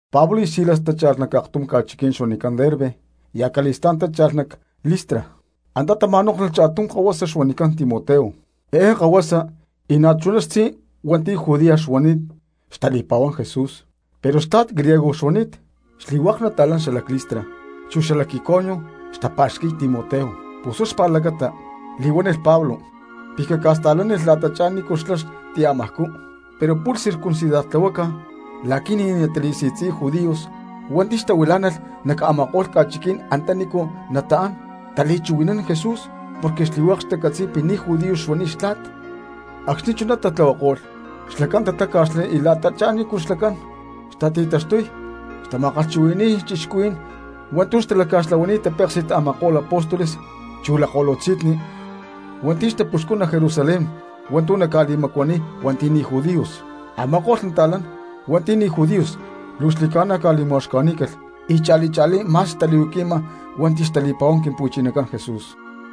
Pablo y Silas tácha̠lh nac aktum ca̠chiquí̠n xuanicán Derbe y acali̠stá̠n tácha̠lh nac Listra. Antá tama̠nóklhulh cha̠tum kahuasa xuanicán Timoteo. Eé kahuasa y na̠ chuná xtzí hua̠nti̠ judía xuani̠t xtali̠pa̠huán Jesús, pero xtla̠t griego xuani̠t. Xli̠hua̠k nata̠lán xalac Listra chu xalac Iconio xtapa̠xqui̠y Timoteo. Pus huá xpa̠lacata li̠huánilh Pablo pi̠ caca̠sta̠lánilh la̠tachá nícu xlá xtiamajcú. Pero pu̠lh circuncidartlahuácalh la̠qui̠ ni̠ natali̠si̠tzi̠y judíos hua̠nti̠ xtahuilá̠nalh nac a̠ma̠ko̠lh ca̠chiqui̠ní̠n antanícu nataán tali̠chuhui̠nán Jesús porque xli̠hua̠k xcatzi̠cán pi̠ ni̠ judío xuani̠t xtla̠t. Acxni̠ chuná tatlahuako̠lh xlacán tatáca̠xli y la̠ta xanícu xlacán xtati̠taxtuy xtali̠ma̠kalhchuhui̠ni̠y cristianos hua̠ntu̠ xtalaca̠xtlahuani̠t tapéksi̠t a̠ma̠ko̠lh apóstoles chu lakko̠lutzi̠nni hua̠nti̠ xtapuxcún nac Jerusalén hua̠ntu̠ naca̠li̠macuaniy hua̠nti̠ ni̠ judíos. Ama̠ko̠lh nata̠lán hua̠nti̠ ni̠ judíos luu xli̠ca̠na ca̠li̠ma̠uxca̠ní̠calh, y cha̠li cha̠lí ma̠s xtali̠huaqui̠ma hua̠nti̠ xtali̠pa̠huán Quimpu̠chinacán Jesús.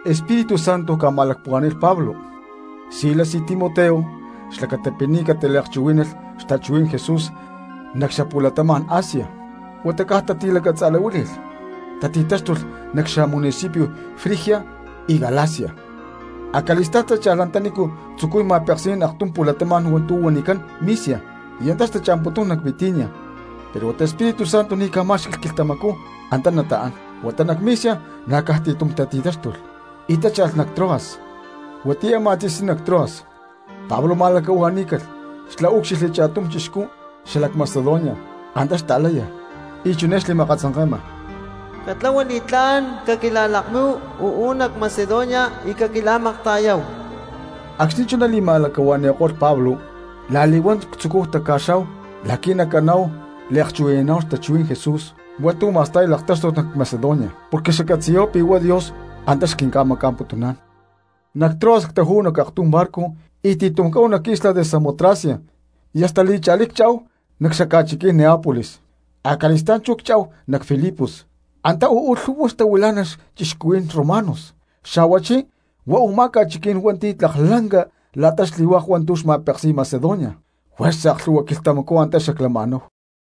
Espíritu Santo ca̠ma̠lacpuhuá̠ni̠lh Pablo, Silas y Timoteo xlacata pi̠ ni̠ cataliakchuhuí̠nalh xtachuhuí̠n Jesús nac xapu̠latama̠n Asia, huata caj tati̠lacatza̠lahuíli̠lh, tati̠taxtulh nac xamunicipio Frigia y Galacia. Acali̠stá̠n tácha̠lh antanícu tzucuy ma̠peksi̠nán aktum pu̠latama̠n hua̠ntu̠ xuanicán Misia y antá xtacha̠mputún nac Bitinia, pero huata Espíritu Santo ni̠ ca̠má̠xqui̠lh quilhtamacú antá nataán. Huata nac Misia na̠ caj ti̠tum tati̠táxtulh y tácha̠lh nac Troas. Huatiyá a̠má tzi̠sní nac Troas Pablo ma̠lacahua̠ní̠calh xlá úcxilhli cha̠tum chixcú xalac Macedonia antá xlakaláya y chiné xli̠ma̠akatzanke̠ma: “Catlahua li̠tlá̠n, caquila̠lakmíhu uú nac Macedonia y caquila̠makta̠yáhu.” Acxni̠ chuná li̠ma̠lacahua̠ni̠ko̠lh Pablo, la̠li̠huán ctzucúhu taca̠xá̠hu la̠qui̠ nacaná̠hu liakchuhui̠naná̠hu xtachuhuí̠n Jesús hua̠ntu̠ ma̠sta̠y laktáxtut nac Macedonia porque xaccatzi̠yá̠hu pi̠ huá Dios antá xquinca̠maca̠mputún. Nac Troas ctajú̠hu nac aktum barco y ti̠tum cáhu nac isla de Samotracia y hasta li̠cha̠lí cchá̠hu nac xaca̠chiquí̠n Neapolis. Acali̠stá̠n chú cchá̠hu nac Filipos, antá uú lhu̠hua xtahuilá̠nalh cristianos romanos, xa̠huachí huá u̠má ca̠chiquí̠n hua̠ntu̠ tlak lanca la̠ta xli̠hua̠k hua̠ntu̠ xca̠ma̠peksi̠y Macedonia; juerza aklhu̠hua quilhtamacú antá xaclama̠náhu.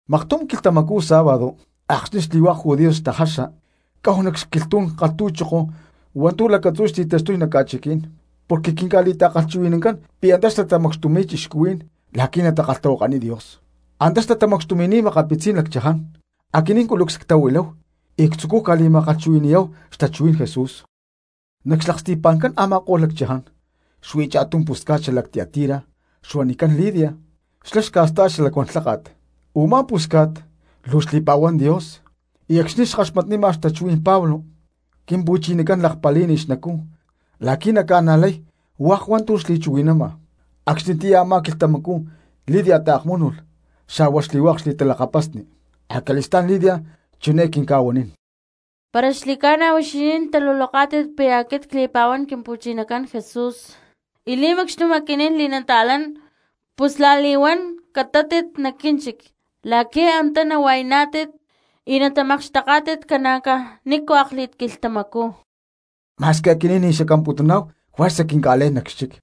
Maktum quilhtamacú sábado acxni̠ xli̠hua̠k judíos xtajaxa cáhu nac xquilhtú̠n kalhtu̠choko hua̠ntu̠ lacatzú xti̠taxtuy nac ca̠chiquí̠n, porque quinca̠li̠ta̠kalhchuhui̠nancán pi̠ antá xtatamacxtumi̠y cristianos la̠qui̠ natakalhtahuakaniy Dios. Antá xtatamacxtumi̠ni̠t makapitzí̠n lacchaján, aquinín culucs ctahuiláhu y ctzucúhu ca̠li̠ma̠kalhchuhui̠ni̠yá̠hu xtachuhuí̠n Jesús. Nac xlaksti̠pa̠ncán a̠ma̠ko̠lh lacchaján xuí cha̠tum pusca̠t xalac Tiatira xuanicán Lidia xlá xca̠sta̠y xalacuán lháka̠t, u̠má pusca̠t luu xli̠pa̠huán Dios y acxni̠ xkaxmatnima xtachuhuí̠n Pablo Quimpu̠chinacán lakpalí̠nilh xnacú la̠qui̠ naca̠najlay hua̠k hua̠ntu̠ xli̠chuhui̠nama. Acxnitiyá a̠má quilhtamacú Lidia taakmúnulh xa̠hua xli̠hua̠k xli̠talakapasni. Acali̠stá̠n Lidia chiné quinca̠huanín: —Para xli̠ca̠na huixinín taluloká̠tit pi̠ aquit cli̠pa̠huán Quimpu̠chinacán Jesús y li̠macxtum aquinín li̠nata̠lán pus la̠li̠huán catátit nac quínchic la̠qui̠ antá nahua̠yaná̠tit y natamakxteká̠tit ca̠na̠caj nícu akli̠t quilhtamacú. Ma̠squi aquinín ni̠ xacamputuná̠hu, juerza quinca̠lé̠n nac xchic.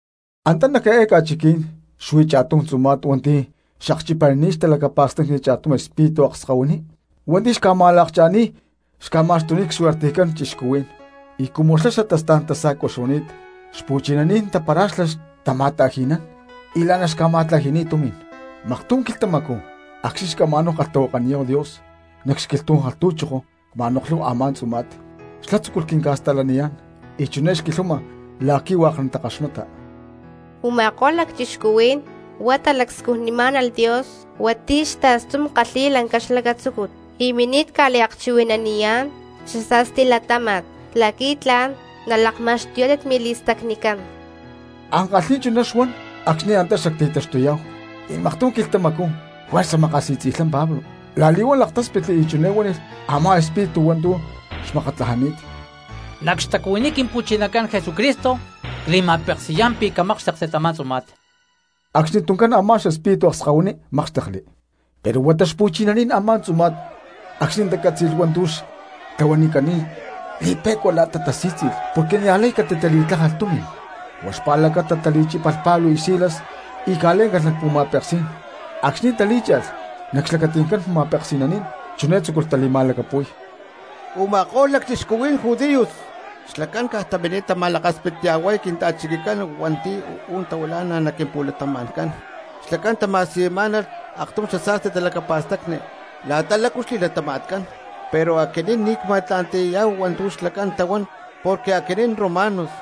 Antá nac eé ca̠chiquí̠n xuí cha̠tum tzuma̠t hua̠nti̠ xakchipanini̠t xtalacapa̠stacni cha̠tum xespíritu akskahuiní hua̠nti̠ xca̠ma̠lakcha̠ni̠y xca̠ma̠xtuniy csuertejcán cristianos, y cumu xlá xatastá̠n tasa̠cua xuani̠t xpu̠chinaní̠n tapara̠xlá xtama̠ta̠ji̠nán y la̠ná xca̠ma̠tlaji̠ni̠t tumi̠n. Maktum quilhtamacú acxni̠ xacama̠náhu kalhtahuakaniyá̠hu Dios nac xquilhtú̠n kalhtu̠choko cma̠noklhúhu a̠má tzuma̠t. Xlá tzúculh quinca̠sta̠laniyá̠n y chiné xquilhama la̠qui̠ hua̠k natakaxmata. —¡Uma̠ko̠lh lacchixcuhuí̠n huá talacscujnimá̠nalh Dios hua̠nti̠ xta̠stum kalhi̠y lanca xlacatzúcut, y mini̠t ca̠li̠akchuhui̠naniyá̠n xasa̠sti latáma̠t la̠qui̠ tla̠n nalakma̠xtuyá̠tit mili̠stacnicán! Ankalhí̠n chuná xuan acxni̠ antá xacti̠taxtuyá̠hu y maktum quilhtamacú juerza makasi̠tzi̠lhá Pablo, la̠li̠huán laktáspitli y chiné huánilh a̠má espíritu hua̠ntu̠ xmakatlajani̠t: —¡Nac xtacuhuiní Quimpu̠chinacán Jesucristo cli̠ma̠peksi̠yá̠n pi̠ camákxtekti tamá tzuma̠t! Acxnituncán a̠má xespíritu akskahuiní mákxtekli. Pero huata xpu̠chinaní̠n a̠má tzuma̠t acxni̠ tacátzi̠lh hua̠ntu̠ xtlahuanicani̠t li̠pe̠cua la̠ta tasí̠tzi̠lh porque niajlay catitali̠tlájalh tumi̠n, huá xpa̠lacata tali̠chípalh Pablo y Silas y ca̠lé̠ncalh nac pu̠ma̠peksí̠n. Acxni̠ talí̠cha̠lh nac xlacati̠ncán ma̠peksi̠naní̠n chiné tzúculh tali̠ma̠lacapu̠y: —¡Uma̠ko̠lh lacchixcuhuí̠n judíos xlacán caj tamini̠t tama̠lakaspitya̠huay cristianos hua̠nti̠ uú tahuilá̠nalh nac quimpu̠latama̠ncán! Xlacán tama̠siyunimá̠nalh cristianos aktum xasa̠sti talacapa̠stacni la̠ta lácu luu xli̠latama̠tcán, pero aquinín ni̠ cma̠tla̠nti̠yá̠hu hua̠ntu̠ xlacán tahuán porque aquinín romanos.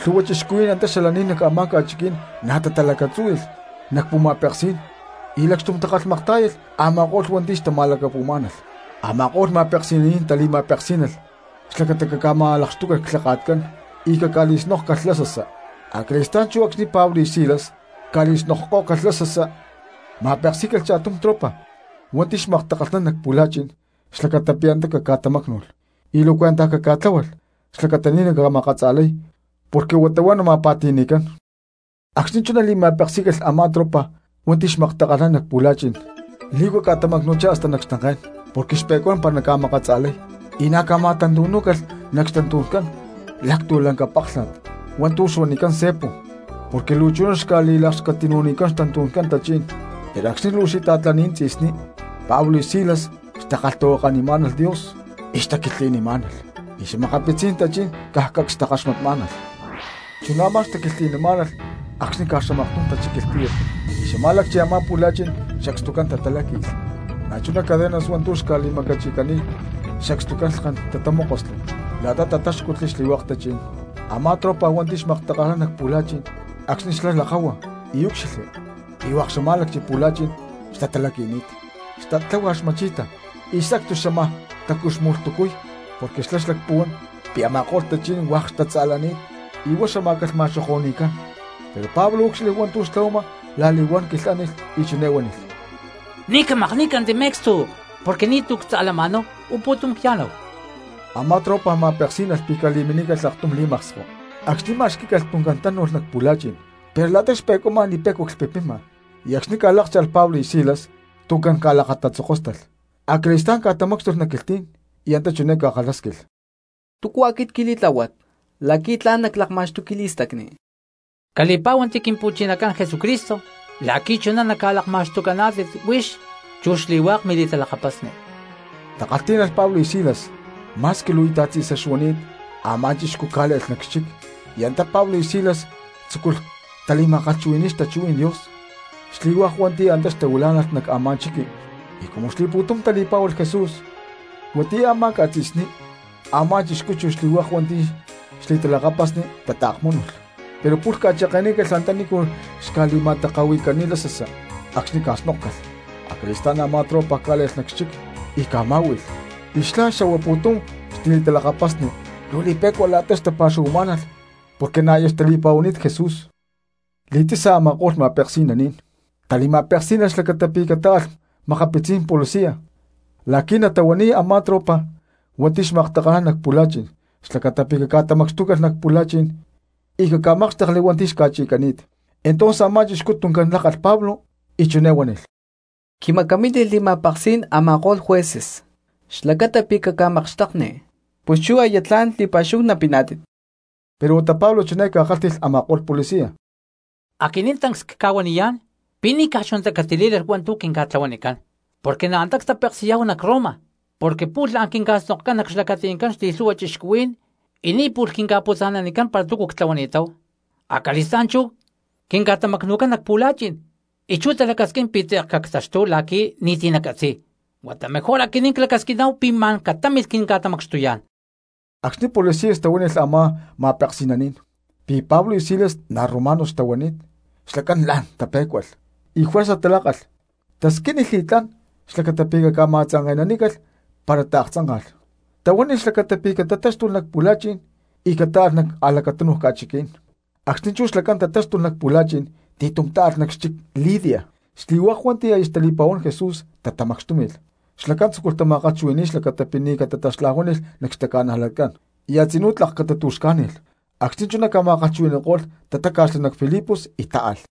Lhu̠hua cristianos antá xalaní̠n nac a̠má ca̠chiquí̠n na̠ tatalacatzúhui̠lh nac pu̠ma̠peksí̠n y lacxtum takalhmaktá̠yalh a̠ma̠ko̠lh hua̠nti̠ xtatalacapu̠má̠nalh. Ama̠ko̠lh ma̠peksi̠naní̠n tali̠ma̠peksí̠nalh xlacata pi̠ caca̠ma̠lakxtúcalh clhaka̠tcán y caca̠li̠snókcalh lasasa. Acali̠stá̠n chú acxni̠ Pablo y Silas ca̠li̠snokkó̠calh lasasa, ma̠peksí̠calh cha̠tum tropa hua̠nti̠ xmaktakalhnán nac pu̠la̠chi̠n xlacata pi̠ antá caca̠tamácnu̠lh y luu cuentaj caca̠tláhualh xlacata ni̠ naca̠makatza̠lay porque huata huá nama̠pa̠ti̠ni̠cán. Acxni̠ chuná li̠ma̠peksí̠calh a̠má tropa hua̠nti̠ xmaktakalhnán nac pu̠la̠chi̠n li̠huaca ca̠tamacnu̠chá hasta nac xtanké̠n, porque xpe̠cuán para naca̠makatza̠lay, y na̠ ca̠ma̠tantu̠nú̠calh xtantu̠ncán lactu̠lanca páklha̠t hua̠ntu̠ xuanicán cepo porque luu chuná xca̠li̠lakxquitinu̠nicán xtantu̠ncán tachí̠n. Pero acxni̠ luu xita̠tlani̠t tzi̠sní Pablo y Silas xtakalhtahuakanimá̠nalh Dios y xtaquilhtli̠nimá̠nalh, y xa̠makapitzí̠n tachí̠n caj cacs xtakaxmatmá̠nalh. Chuná a̠má xtaquilhtli̠má̠nalh acxni̠ caj xamaktum tachíquilh tíyat y xamá̠lacchi a̠má pu̠la̠chi̠n sacstucán tataláqui̠lh, na̠chuná cadenas hua̠ntu̠ xca̠li̠macachi̠cani̠t sacstucán lhken tatamókosli la̠ta tatáxcutli xli̠hua̠k tachí̠n. Amá tropa hua̠nti̠ xmaktakalhnán nac pu̠la̠chi̠n acxni̠ xlá lakáhua y úcxilhli pi̠ hua̠k xamá̠lacchi pu̠la̠chi̠n xtatalaqui̠ni̠t, xtat tláhualh xma̠chi̠ta y sacstu xámaj tacuxmu̠lhtucuy porque xlá xlacpuhuán pi̠ a̠ma̠ko̠lh tachi̠ní̠n hua̠k xtatza̠lani̠t y huá xamá̠calh ma̠xoko̠ni̠cán. Pero Pablo úcxilhli hua̠ntu̠ xtlahuama, la̠li̠huán quilhánilh y chiné huánilh: —¡Ni̠ camakní̠canti me̠cstu, porque ni̠tu̠ ctza̠lama̠náhu, uú pu̠tum cya̠náhu! Amá tropa ma̠peksí̠nalh pi̠ cali̠minícalh aktum li̠maksko, acxni̠ ma̠xquí̠calh tuncán tánu̠lh nac pu̠la̠chi̠n pero la̠ta xpe̠cuama li̠pe̠cua clhpipima, y acxni̠ ca̠lákcha̠lh Pablo y Silas tuncán ca̠lakatatzokóstalh. Acali̠stá̠n ca̠tamácxtulh nac quilhtí̠n y antá chiné ca̠kalhásquilh: —¿Túcu aquit quili̠tláhuat la̠qui̠ tla̠n naclakma̠xtuy quili̠stacni? —Cali̠pá̠huanti Quimpu̠chinacán Jesúcristo la̠qui̠ chuná naca̠lakma̠xtucaná̠tit huix chu xli̠hua̠k mili̠talakapasni —takalhtí̠nalh Pablo y Silas. Ma̠squi luu íta̠t tzi̠sa xuani̠t a̠má chixcú cá̠le̠lh nac xchic y antá Pablo y Silas tzúculh tali̠ma̠kalhchuhui̠ni̠y xtachuhuí̠n Dios xli̠hua̠k hua̠nti̠ antá xtahuilá̠nalh nac a̠má chiqui. Y cumu xli̠pu̠tum tali̠pá̠hualh Jesús, huatiyá a̠má ca̠tzi̠sní a̠má chixcú chu xli̠hua̠k hua̠nti̠ xli̠talakapasni tataakmúnulh, pero pu̠lh ca̠cheke̠nícalh antanícu xca̠li̠ma̠taka̠hui̠cani̠t lasasa acxni̠ ca̠snókcalh. Acali̠stá̠n a̠má tropa cá̠le̠lh nac xchic y ca̠má̠hui̠lh y xlá xa̠hua pu̠tum xli̠talakapasni luu li̠pe̠cua la̠ta xtapa̠xuhuamá̠nalh porque na̠ aya xtali̠pa̠huani̠t Jesús. Li̠tzi̠sa a̠ma̠ko̠lh ma̠peksi̠naní̠n tali̠ma̠peksí̠nalh xlacata pi̠ catáalh makapitzí̠n policias la̠qui̠ natahuaniy a̠má tropa hua̠nti̠ xmaktakalhnán nac pu̠la̠chi̠n xlacata pi̠ caca̠tamacxtulhá nac pu̠la̠chi̠n y caca̠mákxtekli hua̠nti̠ xca̠chi̠cani̠t. Entonces a̠má chixcú tuncán lákalh Pablo y chiné huánilh: —Quimacamínilh li̠ma̠peksí̠n a̠ma̠ko̠lh jueces xlacata pi̠ cacca̠makxtekni, pus chú aya tla̠n li̠pa̠xúhu napiná̠tit. Pero huata Pablo chiné ca̠huánilh a̠ma̠ko̠lh policia: —Aquinín tancs cca̠huaniyá̠n pi̠ ni̠caj chunatá catilí̠lalh hua̠ntu̠ quinca̠tlahuanicán, porque na̠ antá ctapeksi̠yá̠hu nac Roma; porque pu̠lh la̠n quinca̠snokcán nac xlacati̠ncán xli̠lhu̠hua cristianos y ni̠ pu̠lh quinca̠putza̠nanicán para túcu ctlahuani̠táhu, acali̠stá̠n chú quinca̠tamacnu̠cán nac pu̠la̠chi̠n, y chú talacasquín pi̠ tze̠k cactaxtúhu la̠qui̠ ni̠ti̠ nacatzi̠y. ¡Huata mejor aquinín clacasquiná̠hu pi̠ ma̠n catámilh quinca̠tamacxtuyá̠n! Acxni̠ policias tahuánilh a̠ma̠ko̠lh ma̠peksi̠naní̠n pi̠ Pablo y Silas na̠ romanos xtahuani̠t xlacán la̠n tapé̠cualh. Y juerza talákalh, tasquínilh li̠tlá̠n xlacata pi̠ caca̠ma̠tzanke̠nanícalh para taaktzánka̠lh, y tahuánilh xlacata pi̠ catatáxtulh nac pu̠la̠chi̠n y catáalh nac a̠lacatúnuj ca̠chiquí̠n. Acxni̠ chú xlacán tatáxtulh nac pu̠la̠chi̠n ti̠tum ta̠alh nac xchic Lidia, y xli̠hua̠k hua̠nti̠ aya xtali̠pa̠huán Jesús tatamacxtúmi̠lh xlacán tzúculh tama̠kalhchuhui̠ni̠y xlacata pi̠ ni̠ catataxlajuáni̠lh nac xtaca̠najlatcán y a̠tzinú tlak catatu̠xcá̠ni̠lh. Acxni̠ chuná ca̠ma̠kalhchuhui̠ni̠ko̠lh tatáca̠xli nac Filipos y táalh.